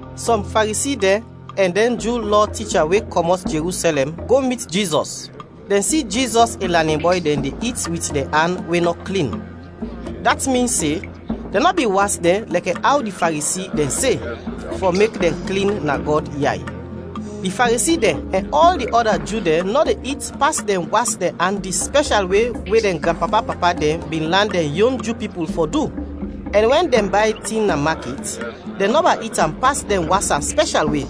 Sɔm Faresi dɛn ɛn dɛn Ju Lɔ ticha we kɔmɔt Jerusɛlɛm go mit Jizɔs. Dɛn si Jizɔs in lanin bɔy dɛn de it wit dɛn an we nɔ klin, dat min se dɛn nɔ bin was dɛn lɛkɛ aw di Faresi dɛn se, fɔ mek dɛn klin na Gɔd yay. ( Di Faresi dɛn ɛn ɔl di ɔda Ju dɛn nɔ de it pas dɛn was dɛn an di spɛshal we we dɛn granpapa-papa dɛn bin lan dɛn yon Ju pipul fɔ du; ɛn wɛn dɛn bay tin na makit, dɛn nɔba it am pas dɛn was am spɛshal we;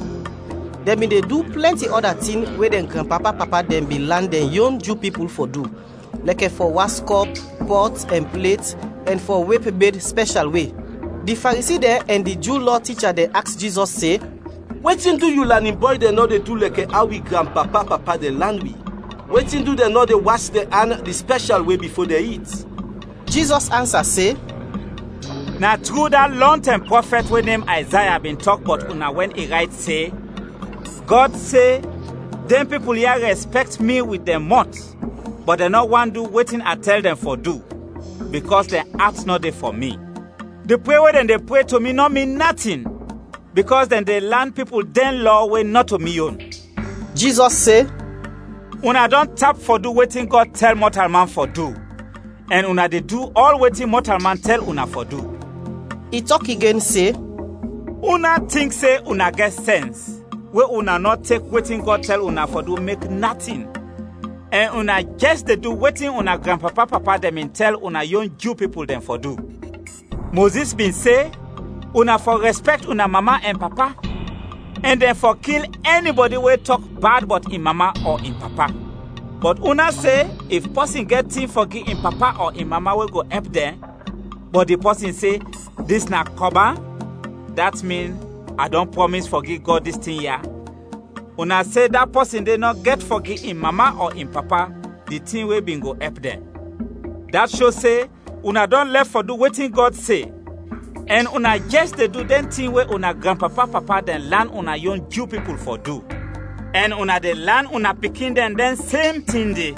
dɛn bin de du plɛnti ɔda tin we dɛn granpapa-papa dɛn bin lan dɛn yon Ju pipul fɔ du, lɛkɛ fɔ was kɔp, pɔt ɛn plet ɛn fɔ wep bed spɛshal we.) Di Faresi dɛn ɛn di Ju Lɔ ticha dɛn aks Jizɔs se, “Wetin du yu lanin bɔy dɛn nɔ de du lɛkɛ aw wi granpapa-papa dɛn lan wi? Wetin du dɛn nɔ de was dɛn an di spɛshal we bifo dɛn it?” Jizɔs ansa se, “Na tru da lɔntɛm prɔfɛt we nem Ayzaya bin tɔk bɔt una wɛn i rayt se, ‘Gɔd se, dɛn pipul ya rɛspɛkt mi wit dɛn mɔt, bɔt dɛn nɔ want du wetin a tɛl dɛn fɔ du, bikɔs dɛn at nɔ de fɔ mi. Di pre we dɛn de pre to mi nɔ min natin, bikɔs dɛn de lan pipul dɛn lɔ we nɔto mi yon!’” Jizɔs se, “Una dɔn tap fɔ du wetin Gɔd tɛl mɔtalman fɔ du, ɛn una de du ɔl wetin mɔtalman tɛl una fɔ du.” I tɔk igen se, “Una tink se una gɛt sɛns we una nɔ tek wetin Gɔd tɛl una fɔ du mek natin ɛn una jɛs de du wetin una granpapa-papa dɛn bin tɛl una yon Ju pipul dɛn fɔ du! Mozis bin se, ‘Una fɔ rɛspɛkt una mama ɛn papa; ɛn dɛn fɔ kil ɛnibɔdi we tɔk bad bɔt in mama ɔ in papa.’ Bɔt una se if pɔsin gɛt tin fɔ gi in papa ɔ in mama we go ɛp dɛn, bɔt di pɔsin se, ‘Dis na Kɔban’ (dat min, a dɔn prɔmis fɔ gi Gɔd dis tin ya), una se da pɔsin de nɔ gɛt fɔ gi in mama ɔ in papa di tin we bin go ɛp dɛn. Dat sho se una dɔn lɛf fɔ du wetin Gɔd se, ɛn una jɛs de du dɛn tin we una granpapa-papa dɛn lan una yon Ju pipul fɔ du, ɛn una de lan una pikin dɛn dɛn sem tin de.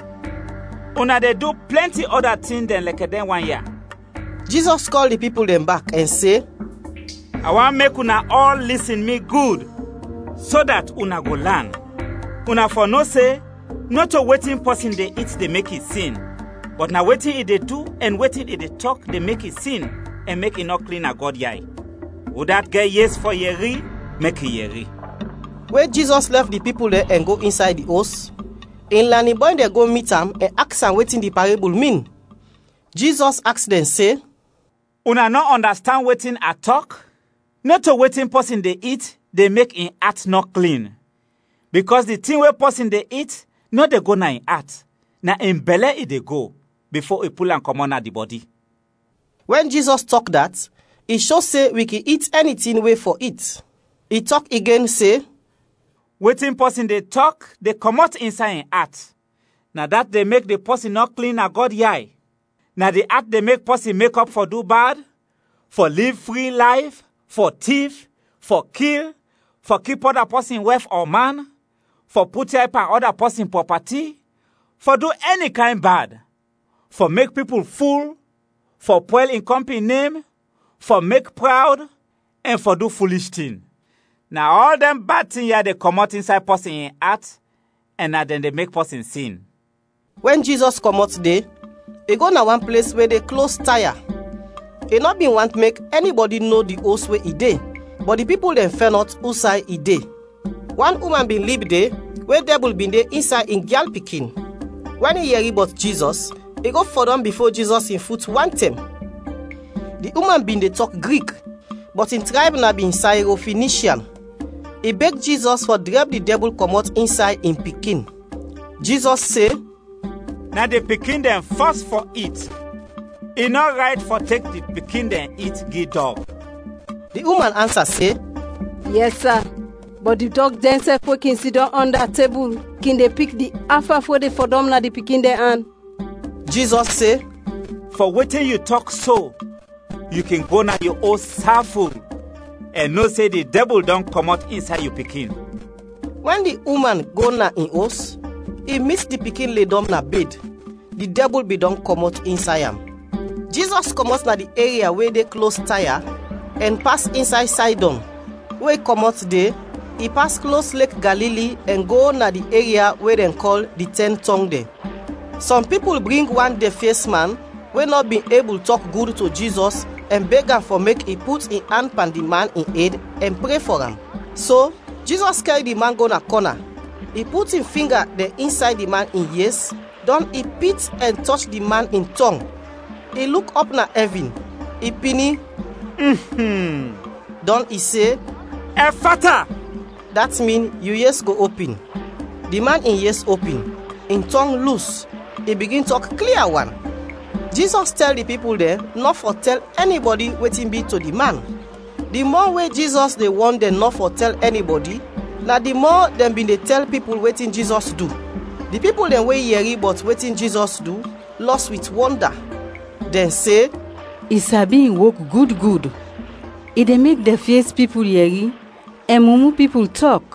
Una de du plɛnti ɔda tin dɛn lɛkɛ dɛn wan ya.” Jizɔs kɔl di pipul dɛn bak ɛn se, “A want mek una ɔl lisin mi gud, so dat una go lan. Una fɔ no se, nɔto wetin pɔsin de it de mek i sin, bɔt na wetin i de du ɛn wetin i de tɔk de mek i sin ɛn mek i nɔ klin na Gɔd yay. [ Udat gɛt yes fɔ yɛri, mek i yɛri.]” We Jizɔs lɛf di pipul dɛn ɛn go insay di os, in lanin bɔy dɛn go mit am ɛn aks am wetin di parebul min. Jizɔs aks dɛn se, “Una nɔ ɔndastand wetin a tɔk? Nɔto wetin pɔsin de it de mek in at nɔ klin, bikɔs di tin we pɔsin de it nɔ de go na in at, na in bɛlɛ i de go, bifo i pul am kɔmɔt na di bɔdi.” (Wɛn Jizɔs tɔk dat, i sho se wi kin it ɛni tin we fɔ it.) I tɔk igen se, “Wetin pɔsin de tɔk de kɔmɔt insay in at, na dat de mek di pɔsin nɔ klin na Gɔd yay. Na di at de mek pɔsin mekɔp fɔ du bad, fɔ liv fri layf, fɔ tif, fɔ kil, fɔ kip ɔda pɔsin wɛf ɔ man, fɔ put yay pan ɔda pɔsin prɔpati, fɔ du ɛni kayn bad, fɔ mek pipul ful, fɔ pwɛl in kɔmpin nem, fɔ mek prawd, ɛn fɔ du fulish tin. Na ɔl dɛn bad tin ya de kɔmɔt insay pɔsin in at ɛn na dɛn de mek pɔsin sin.” Wɛn Jizɔs kɔmɔt de, i go na wan ples we de klos Taya. I nɔ bin want mek ɛnibɔdi no di os we i de, bɔt di pipul dɛn fɛnɔt usay i de. Wan uman bin lib de we dɛbul bin de insay in gyal pikin. Wɛn i yɛri bɔt Jizɔs, i go fɔdɔm bifo Jizɔs in fut wantɛm. Di uman bin de tɔk Grik, bɔt in trayb na bin Sayrofinishian. I beg Jizɔs fɔ drɛb di dɛbul kɔmɔt insay in pikin. Jizɔs se, “Na di pikin dɛn fɔs fɔ it, i nɔ rayt fɔ tek di pikin dɛn it gi dɔg.” Di uman ansa se, “Yɛs sa, bɔt di dɔg dɛnsɛf we kin sidɔm ɔnda tebul kin de pik di af-af we de fɔdɔm na di pikin dɛn an.” Jizɔs se, “Fɔ wetin yu tɔk so, yu kin go na yu os saful, ɛn no se di dɛbul dɔn kɔmɔt insay yu pikin.” Wɛn di uman go na in os, i mit di pikin ledɔm na bed; di dɛbul bin dɔn kɔmɔt insay am. Jizɔs kɔmɔt na di eria we de klos Taya, ɛn pas insay Saydɔn; we i kɔmɔt de, i pas klos Lek Galili ɛn go na di eria we dɛn kɔl di Tɛn Tɔng dɛn. Sɔm pipul bring wan dɛfyes man we nɔ bin ebul tɔk gud to Jizɔs ɛn beg am fɔ mek i put in an pan di man in ed ɛn pre fɔ am. So Jizɔs kɛr di man go na kɔna, i put in finga dɛn insay di man in yes, dɔn i pit ɛn tɔch di man in tɔng. I luk ɔp na ɛvin, i pini, dɔn i se, “Ɛffata,” dat min, “Yu yes go opin.” Di man in yes opin, in tɔng lus, i bigin tɔk klia wan. Jizɔs tɛl di pipul dɛn nɔ fɔ tɛl ɛnibɔdi wetin bi to di man. Di mɔ we Jizɔs de wɔn dɛn nɔ fɔ tɛl ɛnibɔdi, na di mɔ dɛn bin de tɛl pipul wetin Jizɔs du. Di pipul dɛn we yɛri bɔt wetin Jizɔs du, lɔs wit wɔnda. Dɛn se, “I sabi in wok gud gud! I de mek dɛfyes pipul yɛri, ɛn mumu pipul tɔk.”